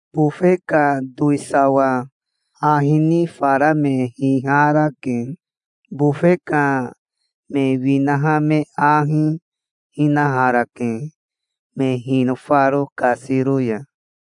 Bofe ka towisawa ahi ni fara me hiharake. Bofe ka me winaha me ahi hinaharake, me hinofaro kasiro ya".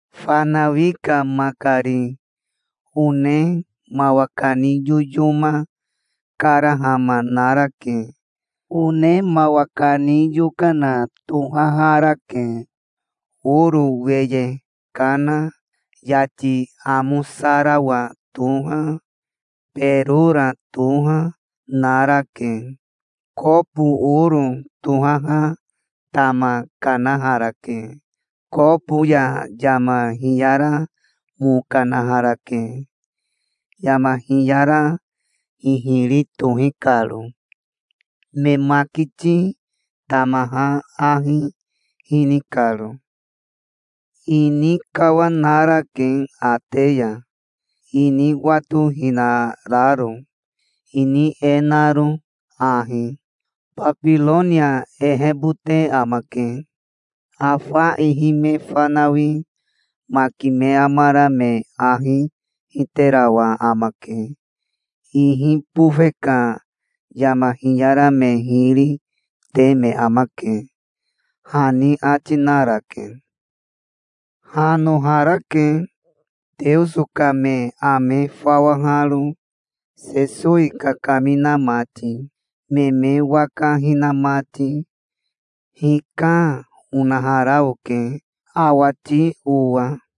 Fanawi ka makari one mawa kani yoyoma karahama narake. One mawa kani yokana tohaharake. Oro weye kana, yati amosarawa toha, berora toha, narake. Kobo oro tohaha tama kanaharake. Kobo ya yama hiyara mo kanaharake, yama hiyara hihiri tohi karo, me makiti tamaha ahi hini karo. Ini kawanarake ate ya, ini watohinararo, ini e naro ahi: "Babironia ehebote amake. Afa ihi me fanawi maki me amara me ahi hiterawa amake. Ihi bofe ka yama hiyara me hiri te me amake", hani ati narake. Hanoharake, Teoso ka me ame fawaharo, Sesowi kakamina mati, me me waka hina mati. "Hika", onahara oke, awati owa.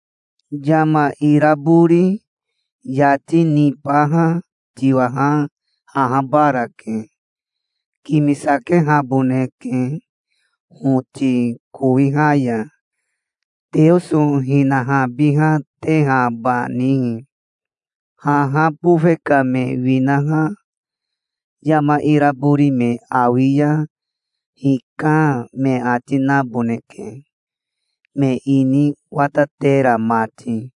Yama irabori yati nibaha tiwaha ahabarake. Kimisakehaboneke hoti kowiha ya, Teoso hinahabihatehabanihi. Haha bofe ka me winaha yama irabori me awi ya 'Hika', me ati naboneke, me ini watatera mati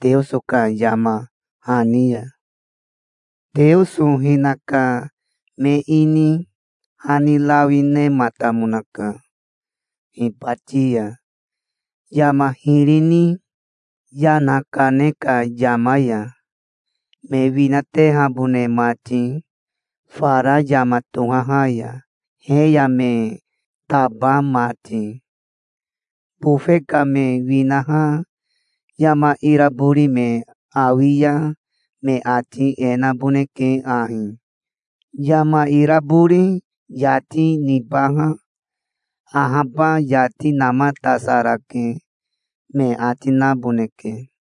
Teoso ka yama hani ya. Teoso hinaka me ini hani rawi nematamonaka hibati ya, yama hiri ni yana kane ka yama ya, me winatehabone mati fara yama tohaha ya, he ya me taba mati. Bofe ka me winaha yama irabori me awi ya me ati e naboneke ahi: 'Yama irabori yati nibaha ahaba yati namatasarake', me ati naboneke".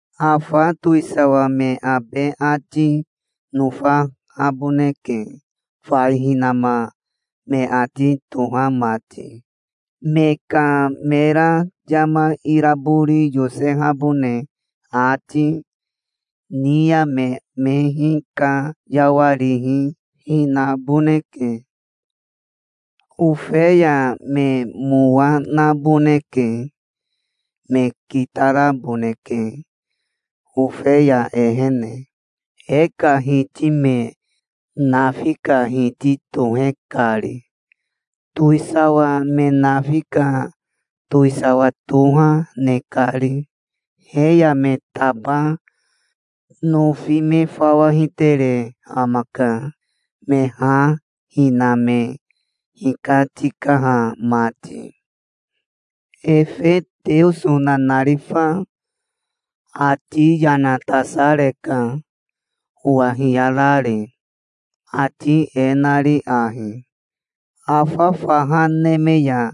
Afa towisawa me abe ati nofahaboneke, fai hinama me ati toha mati. Me ka mera yama irabori yosehabone ati, ni ya me me hikayawarihi hinaboneke. Ofeya me mowa naboneke. Me kitaraboneke Ofeya ehene, e ka Hiti me nafi ka Hiti tohe kari, towisawa me nafi ka towisawa toha ne kari. He ya me taba nofi me fawa hitere amaka, me ha hina me hikatikaha mati". Efe Teoso nanarifa ati yana tasareka, owa hiyarari, ati e nari ahi: "Afa faha neme ya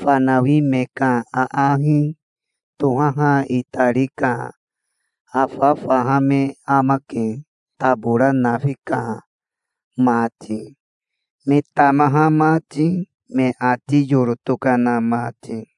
fanawi me ka aahi tohaha itari ka afa faha me amake tabora nafi ka mati, me tamaha mati, me ati yoro tokana mati.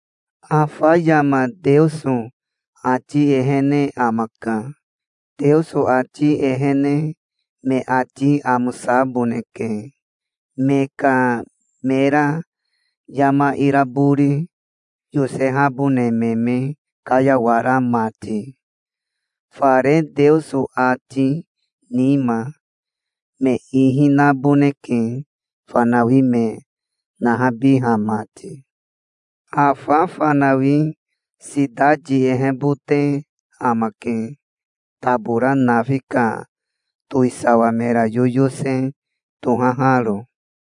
Afa yama Teoso ati ehene amaka. Teoso ati ehene me ati amosaboneke, me ka mera yama irabori yosehabone me me kayawara mati. Fare Teoso ati nima, me ihi naboneke fanawi me nahabiha mati. Afa fanawi sitati ehebote amake, tabora nafi ka towisawa mera yoyose tohaharo".